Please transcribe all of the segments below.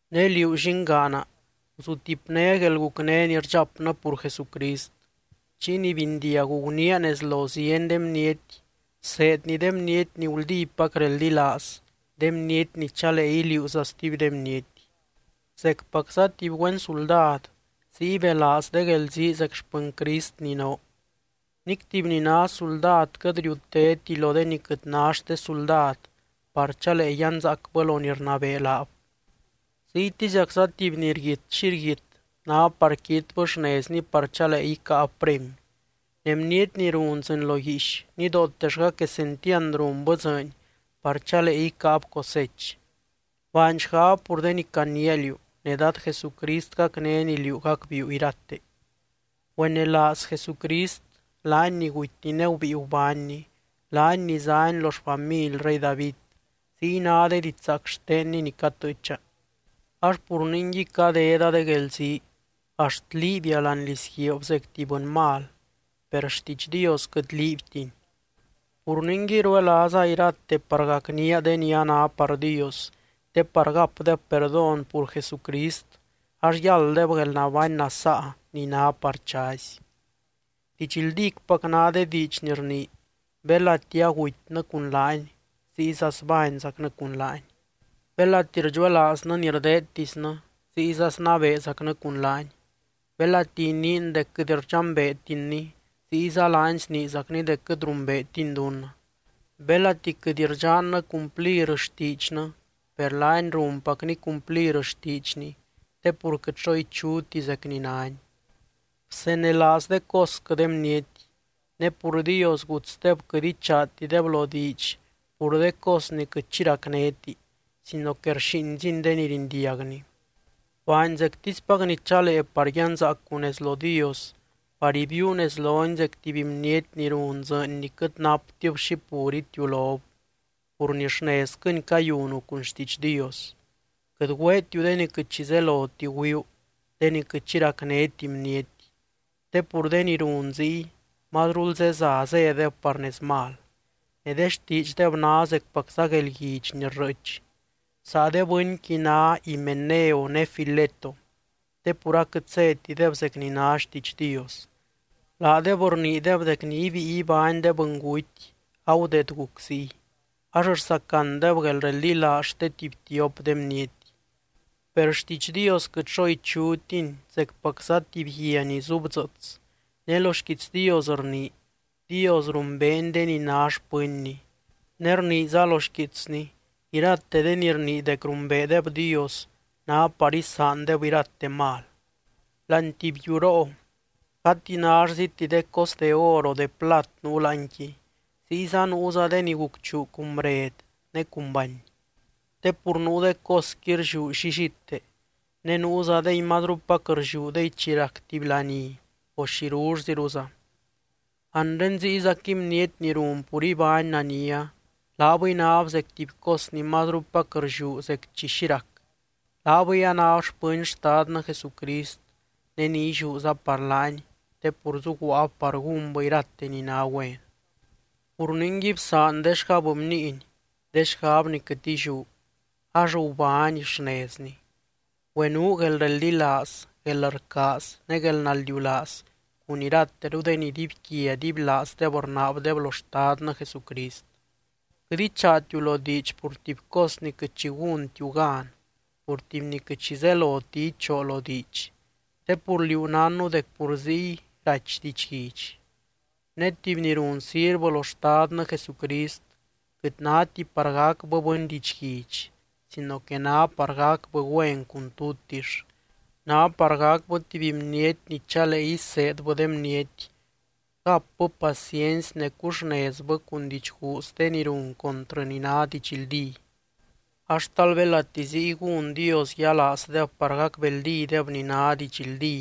Ne liú llingaana, guzutipné guelgucné ni rdxapnɨ pur Jesucrist. Chiy ni bindiagu guniia nez lo zieny de bniety, bseedni de bniety ni guldípac reldilaaz, de bniety ni chalee iliuuza stuby de bniety. Zecpacza tuby güen suldad, ziy belaaz de guelzii zec xpɨny Crist ni noo. Nic tuby ni ná suldad quɨt riutéti lo de ni quɨt ná xte suldad par chalee yanzaacbɨ lo ni rnabee laab. Ziytiziacza tuby ni rguit xi rguit, ná par quitbɨ xnezni par chalee icáab premy. Ne bniety ni run dzɨɨny lo guiix, nidootellga quesentiand runbɨ dzɨɨny par chalee icáab cosech. Baany xgab pur de ni caniia liú, ne Dad Jesucrist gacnény liú gacbiiu irate. Güenelaaz Jesucrist, laany ni gutyny ne gubíi gubánny, laany ni zány lo xfamily rey David, ziy ná de didxzaac xtenny ni catɨɨcha. Ax pur ningui cadeda de guelzii, axt liibia láani lizguiib zec tuby bɨny mal, per xtiidx Dios quɨt liibtini. Pur ningui, ruelaaza irate par gacnía de ni a ná par Dios, te par gapdeb perdón pur Jesucrist ax yálddeb guelnabány nasaa ni ná par chazy. Didxldícpac ná de diidx ni rnii: Belati agutynɨ cun laany, ziyza zbányzacnɨ cun laany. Belati rdxuelaaznɨ ni rdeedtisnɨ, ziyza snabeezacnɨ cun laany. Belati iniin dec quɨt rdxambeetinny, ziyza laany sniizacny dec quɨt rumbeetiny dunnɨ. Belati quɨt rdxannɨ cumplir xtiidxnɨ, per laany runpacny cumplir xtiidxny te pur quɨt xo ichuti zec ni nány. Bsenelaaz de cosquɨ de bniety, ne pur Dios gutsdeb quɨt ichaatideb lo diidx pur de cos ni quɨt xi racnéti sino que rxíinzini de ni rindiagni. Baany zectispac ni chalee par yanzaacu nez lo Dios, par ibiiu nez lony zec tuby bniety ni run dzɨɨny ni quɨt naptib xi pur itiulob, pur ni xnezquɨni cayunu cun xtiidx Dios. Quɨt güeetiu de ni quɨt xi zeloti güiuu, de ni quɨt xi racnéti bniety. Te pur de ni run ziy mazrul zeza zédeb par nez mal, ne de xtiidxdeb ná zecpacza guelguidx ni rrɨɨch. Saa de bɨnqui ná Himeneo ne Fileto, te pur aquɨt zétideb zec ni ná xtiidx Dios. Laadeb rniideb dec ni ibíi ibány de bɨnguty agudeed guc ziy, ax rsacandeb guelreldilaaz xte tuby tiop de bniety. Per xtiidx Dios quɨt xo ichutiny zecpacza tuby guia ni zubdzɨɨts. Ne lo xquiitsny rnii: “Dios rumbeeny de ni ná xpɨnny”, ne rniiza lo xquiitsny: “Irate de ni rnii dec rumbeedeb Dios ná par isaandeb irate mal.” Láani tuby yuroo, gati nállziti de cos de or, o de plat nuu láanqui, ziyza nuuza de ni gucchuu cun bred ne cun bany. Te pur nuu de cosqui rlliú llillite, ne nuuzadey mazrupac rlliúdey chi rac tuby laní o xirullziruza. Anre ziyzaquɨy bniety ni run pur ibány nania, laabɨy náb zec tuby cos ni mazrupac rlliú zec chi xi rac, laabɨy anáb xpɨny Xtadnɨ Jesucrist ne ni illiúza par laany, te pur zuguaab par gúnbɨ irate ni ná güen. Pur ningui bsaan de xgab bniiny, de xgab ni quɨt illiú, ax gubány xnezni. Güenuu guelreldilaaz, guelrcaaz ne guelnaldiulaaz cun irateru de ni dibyquia dibylaazdeb rnaabdeb lo Xtadnɨ Jesucrist. Quɨt ichaatiu lo diidx pur tuby cos ni quɨt xi gúntiu gan, pur tuby ni quɨt xi zeloti ichoo lo diidx, te pur liú nánnu dec pur ziy rachy didxguidx. Ne tuby ni run sirvɨ lo Xtadnɨ Jesucrist quɨt náti par gacbɨ bɨny didxguidx sino que ná par gacbɨ güen cun tutix, ná par gacbɨ tuby bniety ni chalee iseedbɨ de bniety, gapbɨ paciency ne cuxnezbɨ cun didxguuz de ni run contrɨ ni ná didxldí. Ax talbelati ziy gún Dios yialaazdeb par gacbeldídeb ni ná didxldí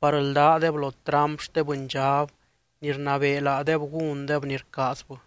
par ldádeb lo tramp xte bɨndxab ni rnabee laadeb gúndeb ni rcaazbɨ.